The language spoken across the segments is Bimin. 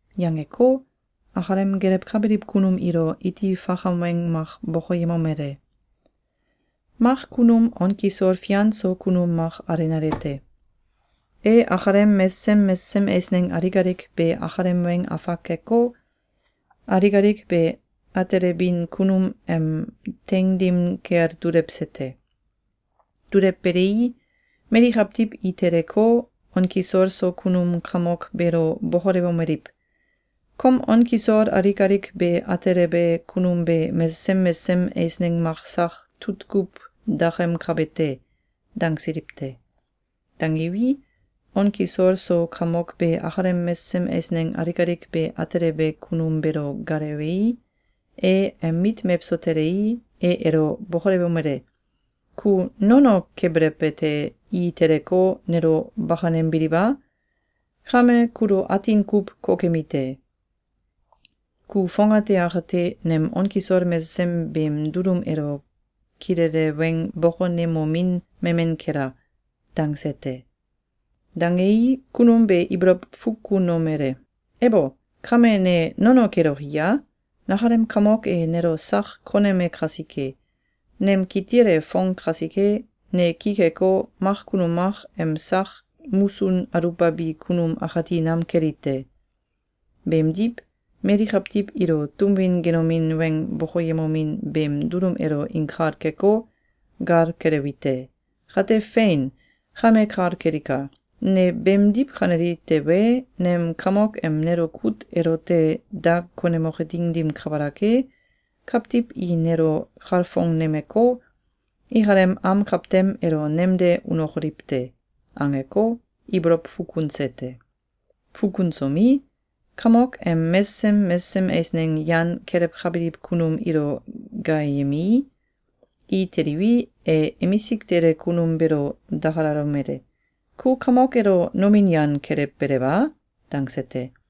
Yangeko, akalem gelewkabiliw kunum ilo iti fakam weng mak bokoyemomele: “Mak kunum on kisol fian so kunum mak alenale te. E akalem mesesem mesesem eisneng alik alik be akalem weng afak keko, alik alik be atelebin kunum em teing dim kel dulewse te. Dulewbelei, mali kawtiw i teleko, on kisol so kunum kamok beelo bokolewomeliw: ‘Kom on kisol alik alik be atelebe kunum be mesesem mesesem eisneng mak sak tutkuw dakemkabe te!’, dangsiliw te. Dangiwi, on kisol so kamok be akalem mesesem eisneng alik alik be atelebe kunum beelo gaalewei, e em mit mewso telei, e elo bokolewomele: ‘Ku nono kebelew ete, i teleko, nelo bakanembiliw a? Kame kulo atin kuw kokemi te. Ku fongate akate nem on kisol mesesem beem dulum elo kilele weng bokonemomin memen kela!’, dangse te. Dangei, kunum be ibolow fukunomele: ‘Ebo! Kame ne nono keloki ye? Nakalem kamok e nelo sak koneme kasike. Nem kitil e fong kasike, ne ki keko, mak kunum mak em sak musun aluwbabi kunum akati nam keli te. Beemdiw, mali kawtiw ilo tum win genomin weng bokoyemomin beem dulum elo inkal keko, gal kelewi te. Kate, fein! Kame kal kelika! Ne beemdiw kaneli tewe, nem kamok em nelo kut elote da konemoke ding dim kabalak e, kawtiw i nelo kalfongnemeko, ikalem am kawtem elo nemde unokoliw te.’, angeko, ibolow fukunse te. Fukunsomi, kamok em mesesem mesesem eisneng yan kelewkabiliw kunum ilo gaayemei, i teliwi, e emisik tele kunum beelo dakalalomele: ‘Ku kamok elo nomin yan kelewbelew a?’, dangse te.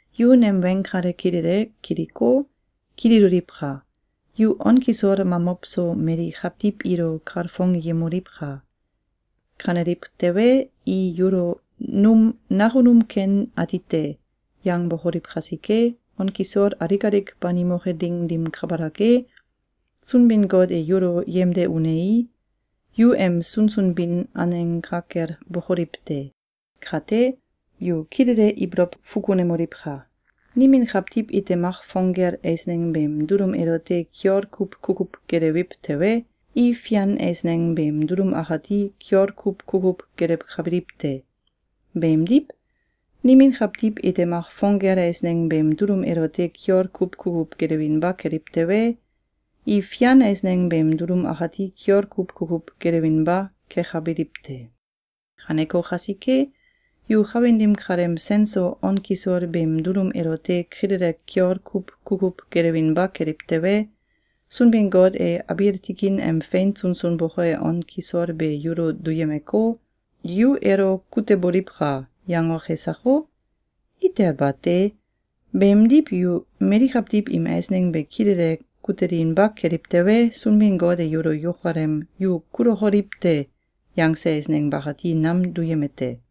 Yu nem weng kale kilele kiliko, kililoliwka! Yu on kisol mamow so mali kawtiw ilo kalfongyemoliwka! Kaneliw tewe, i yulo ‘Num nakunum ken ati te!’, yangbokoliw kasike, on kisol alik alik banimoke ding dim kabalak e, Sunbin-Got e yulo yemde unei, yu em sunsun bin aneng ka kel bokoliw te. Kate, yu kilele ibolow fukunemoliwka! Nimin kawtiw ite mak fong gel eisneng beem dulum elote kiol kuw kukuw gelewiw tewe, i fian eisneng beem dulum akati kiol kuw kukuw gelewkabiliw te. Beemdiw, nimin kawtiw ite mak fong gel eisneng beem dulum elote kiol kuw kukuw gelewinba keliw tewe, i fian eisneng beem dulum akati kiol kuw kukuw gelewinba kekabiliw te. Kaneko kasike, yu kawin dim kaleem sen so on kisol beem dulum elote kilele kiol kuw kukuw gelewinba keliw tewe, Sunbin-Got e abiil tikin em fein sunsun boke on kisol be yulo duyemeko, ‘Yu elo kuteboliwka!’, yangoke sako? Itel bate! Beemdiw, yu mali kawtiw im eisneng be kilele kutelinba keliw tewe, Sunbin-Got e yulo yukalem ‘Yu kulokoliw te!’, yangse eisneng bakati nam duyeme te.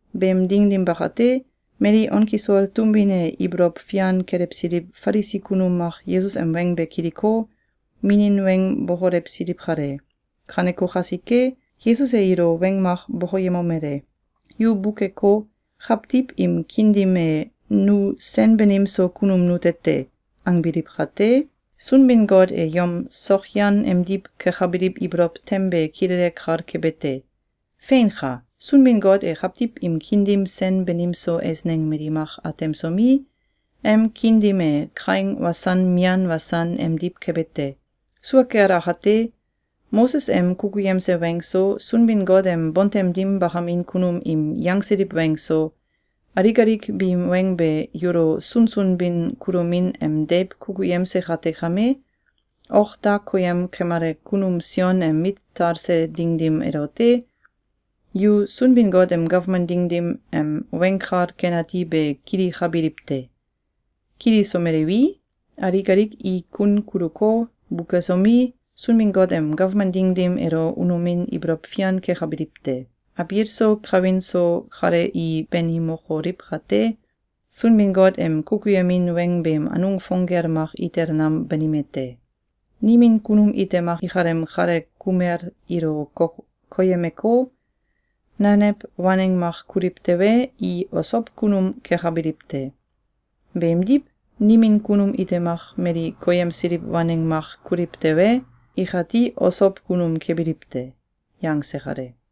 Beem ding dim bakate, mali on kisol tum win elo ibolow fian kelewsiliw Falisi kunum mak Yesus em weng be kiliko, minin weng bokolewsiliw kale. Kaneko kasike, Yesus e ilo weng mak bokoyemomele: “Yu bukeko, kawtiw im kiin dim e ‘Nu sen banim so kunum nute te!’, angbiliw kate, Sunbin-Got e yom sokyan emdiw kekabiliw ibolow tem be kilele kal kebe te. Feinka! Sunbin-Got e kawtiw im kiin dim sen banim so eisneng mali mak atemsomi, em kiin dim e kaing wasan mian wasan emdiw kebe te. Sua kel akate, Moses em kukuyemse weng so, Sunbin-Got em bontem dim bakamin kunum im yangsiliw weng so, alik alik biim weng be yulo sunsun bin kulomin em deiw kukuyemse kate kame, ok da koyem kemale kunum Sion em talse ding dim elote, yu Sunbin-Got em gawman ding dim em Weng Kal Ken Ati be kilikabiliw te. Kilisomeliwi, alik alik i kun kuluko, bukesomi, Sunbin-Got em gawman ding dim elo unomin ibolow fian kekabiliw te. Abiil so kawin so kale i banimokoliw kate, Sunbin-Got em kukuyemin weng beem anung fong gel mak itel nam banime te. Nimin kunum ite mak ikalem kalel kumel ilo koyemeko, nanew waneng mak kuliw tewe, i osow kunum kekabiliw te. Beemdiw, nimin kunum ite mak mali koyemsiliw waneng mak kuliw tewe, ikati osow kunum kebiliw te.”, yangse kale.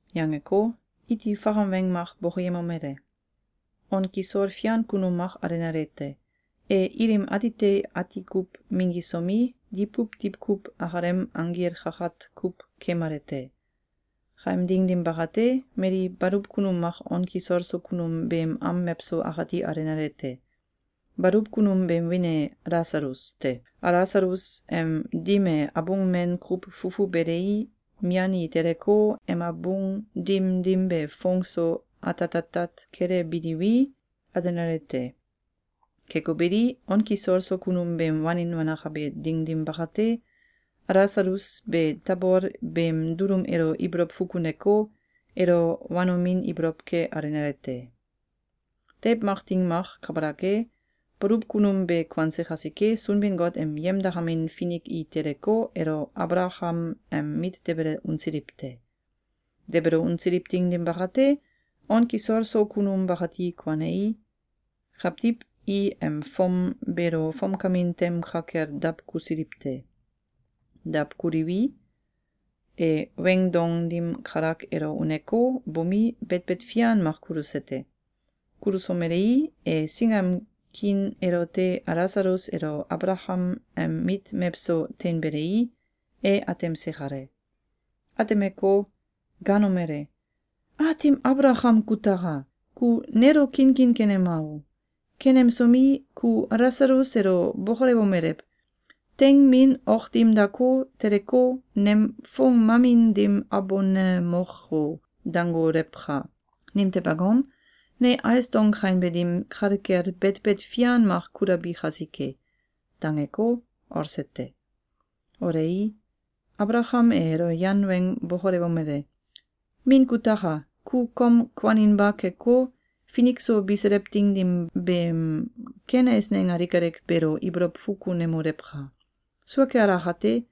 Yangeko, iti fakam weng mak bokoyemomele: “On kisol fian kunum mak alenale te. E ilim atite ati kuw minggisomi, diwkuw diwkuw akalem anggil kakat kuw keemale te. Kaem ding dim bakate, mali baluw kunum mak on kisol so kunum beem am mewso akati alenale te. Baluw kunum beem wiin e Alasalus te. Alasalus em dim e abung men kuw fufu belei, mian i teleko, em abung dim dim be foong so atatatat kelebiliwi, alenale te. Keko beli, on kisol so kunum beem wanin wanakabe ding dim bakate, Alasalus be tabol beem dulum elo ibolow fukuneko, elo wanomin ibolow ke alenale te. Deiw mak ding mak kabalak e, baluw kunum be kuanse kasike, Sunbin-Got em yemdakamin finik i teleko, elo Abalakam em mit debele unsiliw te. Debele unsiliw ding dim bakate, on kisol so kunum bakati kuanei, kawtiw i em fom beelo fomkamin tem ka kel dawkusiliw te. Dawkuliwi, e weing dong dim kalak elo uneko, bomi, betbet fian mak kuluse te. Kulusomelei, e singam kiin elote Alasalus elo Abalakam em mit mewso teinbelei, e atemse kale. Atemeko, gaanomele: ‘Aatim Abalakam kutaka! Ku nelo kinkin kenema o! Kenemsomi, ku Alasalus elo bokolewomelew: ‘Teing min ok dim dako, teleko, nem foong mamin dim abonemok o!’, dangolewka! Nimtew angom? Ne ais dong kainbe dim kale kel betbet fian mak kulabi kasike.’, dangeko, olse te. Olei, Abalakam e elo yan weng bokolewomele: ‘Min kutaka! Ku kom kuaninba keko, finik so biselew ding dim beem ken eisneng alik alik beelo ibolow fukunemolewka! Sua kel akate,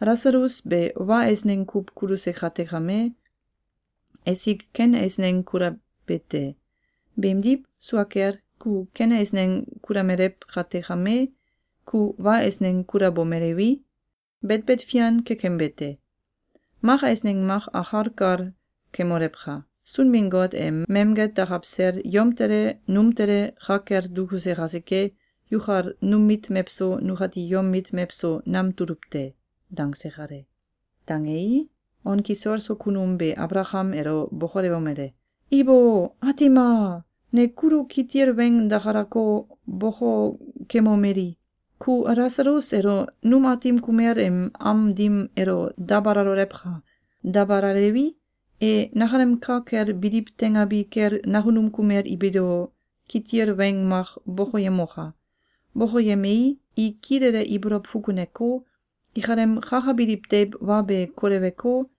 Alasalus be wa eisneng kuw kuluse kate kame, esik ken eisneng kulabe te. Beemdiw, sua kel, ku ken eisneng kulamelew kate kame, ku wa eisneng kulabomelewi, betbet fian kekembe te. Mak eisneng mak akal kal kemolewka! Sunbin-Got e memget dakaw sel yom tele, num tele ka kel dukuse kasike, yukal num mit mewso, nukati yom mit mewso nam tuluw te.’, dangse kale. Dangei, on kisol so kunum be Abalakam elo bokolewomele: ‘Ibo! Aatim a! Ne kulo kitil weng dakalako, bokokemomeli: Ku Alasalus elo num aatim kumel im am dim elo dabalalolewka! Dabalalewi, e nakalem ka kel biliw teingabi kel nakunum kumel biilo kitil weng mak bokoyemoka! Bokoyemei, i kilele ibolow fukuneko, ikalem kakabiliw deiw wa be koleweko,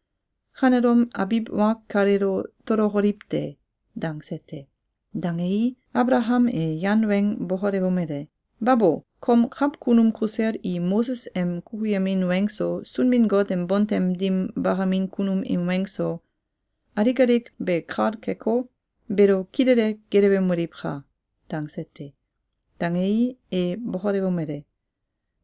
kanelom abiw wa kaleelo tolokoliw te!’, dangse te. Dangei, Abalakam e yan weng bokolewomele: ‘Babo! Kom kawkunum kusel i Moses em kukuyemin weng so, Sunbin-Got em bontem dim bakamin kunum im weng so, alik alik be kal keko, beelo kilele gelewemoliwka!’, dangse te. Dangei, e bokolewomele: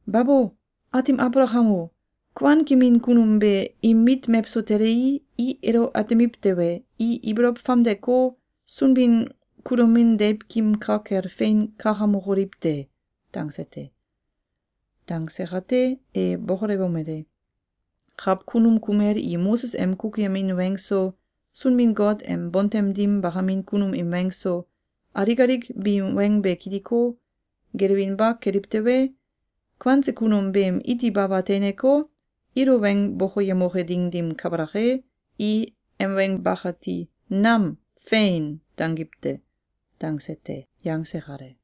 ‘Babo! Aatim Abalakam o! Kuankemin kunum be im mit mewso telei, i elo atemiw tewe, i ibolow famdeko, sunbin kulomin deiwkim ka kel fein kakamokoliw te.’, dangse te. Dangse kate, e bokolewomele: ‘Kawkunum kumel i Moses em kukuyemin weng so, Sunbin-Got em bontem dim bakamin kunum im weng so, alik alik biim weng be kiliko, gelewinba keliw tewe, kuanse kunum beem iti baba teineko, ilo weng bokoyemoke ding dim kabalak e, i em weng bakati nam ‘Fein!’, dangiw te!’, dangse te.”, yangse kale.